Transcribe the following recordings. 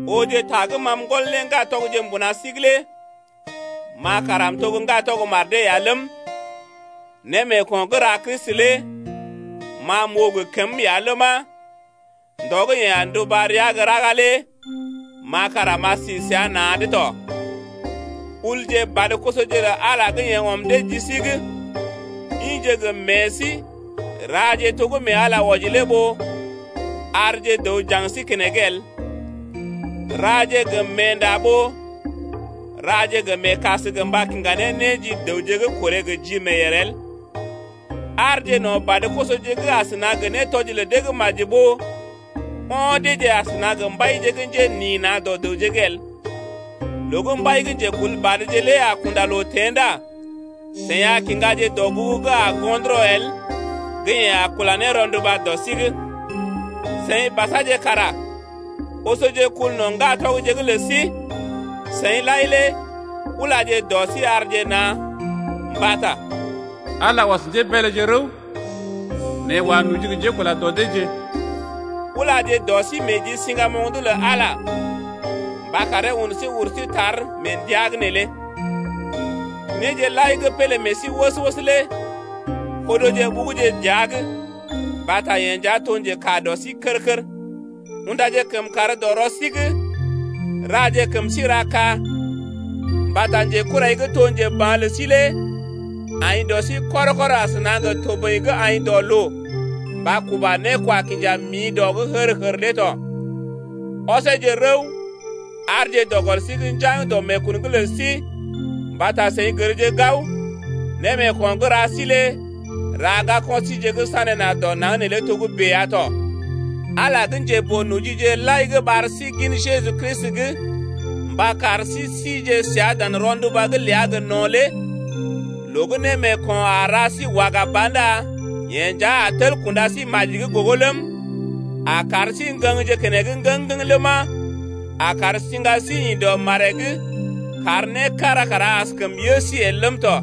Ooje ta gə́ ma m’gɔl ne ŋgatɔgje mbuna sí’g lé ma kara m’to gə́ ŋgatɔg mar dee ya ləm, némeeko̰ gə́ ra Kristi lé ma m’oo gə kəm ya ləma, ndɔ gə́ yeḛ a nduba rəa gə́ raga lé ma kara m’a si səa na̰’d ya ləm tɔ. Ulje badə-kosoje lə Ala gə́ yeḛ ɔm dee ji sí’g, ḭje gə meḛ sí raje to gə́ mee Ala wɔji lé ɓó arje dəw njaŋg sí keneŋ el, raje gə meenda ɓó raje gə meekas gə mba kiŋga ne né ji dəwje’g korè gə ji meeyèr el. Aarje no̰ badə-kosoje’g asəna gə nétɔji lə dee gə́ maji ɓó o̰ deeje asəna gə mbaije gə́ njenḭ na̰ dɔ dəwje’g el. Loo gə́ mbai gə́ njekulbadje lé a kunda loo teḛ ndá seḭ a kiŋgaje dɔgugu gə́ a go̰dərɔ el gə́ yeḛ a kula ne rɔnduba dɔ sí’g. Seḭ basaje kara osoje kul no̰ ŋgatɔgje’g lə sí. Seḭ lai lé ulaje dɔ sí arje na̰, mbata Ala lé ɔs njébeeleje rəw, Nɛ yeḛ wa noji gə njekula dɔ deeje. Ulaje dɔ sí meḛ ji siŋgamoŋ’d lə Ala mba karee un sí ur sí tar mee ndəa’g neelé. Néje lai gə́ pélé meḛ sí wəs-wəs lé odoje ɓuguje dəa’g mbata yeḛ nja to njekaa dɔ sí kər-kər. Undaje kəmkàr dɔ rɔ sí’g, raje kəm sí ra ka. Mbata njekurai gə́ to njeba̰ lə sí lé aḭ dɔ sí kɔr-kɔr asəna gə toboḭ gə́ aḭ dɔ loo mba kuba né kwa kinja miḭ dɔ’g hər-hər lé tɔ. Oseeje rəw, aarje dɔ gɔl sí’g njaŋg dɔ meekun’g lə sí mbata seḭ gərje gao, némeeko̰ gə́ ra sí lé ra ŋgako̰ síje gə́ sané na̰ dɔ naŋg neelé togə́bè ya tɔ. Ala gə́ njeboo-nojije lai gə́ ɓar sí gin Jeju Kristi’g mba kar sí sije səa dan rɔnduba’g ləa gə no̰ lé loo gə́ némeeko̰ a ra sí waga ba ndá yeḛ nja a tel kunda sí maji’g gogo ləm, a kar sí ŋgəŋje keneŋ ŋgəŋ-ŋgəŋ ləma, a kar siŋga sí ḭ dɔ maree’g kar né kára kara askəm yə sí el ləm tɔ.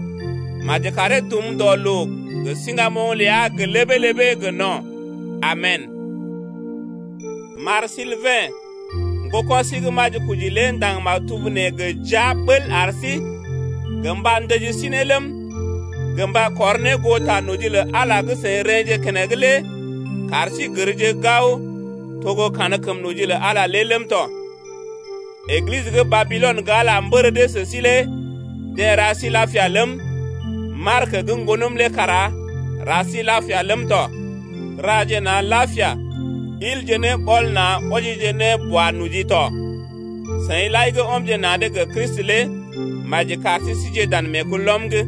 Maji karee dum dɔ loo gə siŋgamoŋ ləa gə ləbee-ləbee gə no̰. Amen! M’ar Silbɛ̰, ŋgoko̰ sí gə́ majikoji lé ndaŋg maktub nee gə jia ɓəl ar sí, gə mba ndəji sí ne ləm, gə mba kɔr ne goo ta noji lə Ala gə́ seḭ rḛ́je keneŋ lé kar sí gərje gao to gə́ kankəm noji lə Ala ləm tɔ. Eglisə gə́ Babilɔn gə́ Ala mbər dee sə sí lé deḛ ra sí lapia ləm, Mark gə́ ŋgonəm lé kara ra sí lapia ləm tɔ. Raje na̰ lapia ilje ne ɓɔl na̰ wɔjije ne bao-noji tɔ. Seḭ lai gə́ ɔmje na̰’d gə Kristi lé maji kar sí sije dan meekulɔm’g.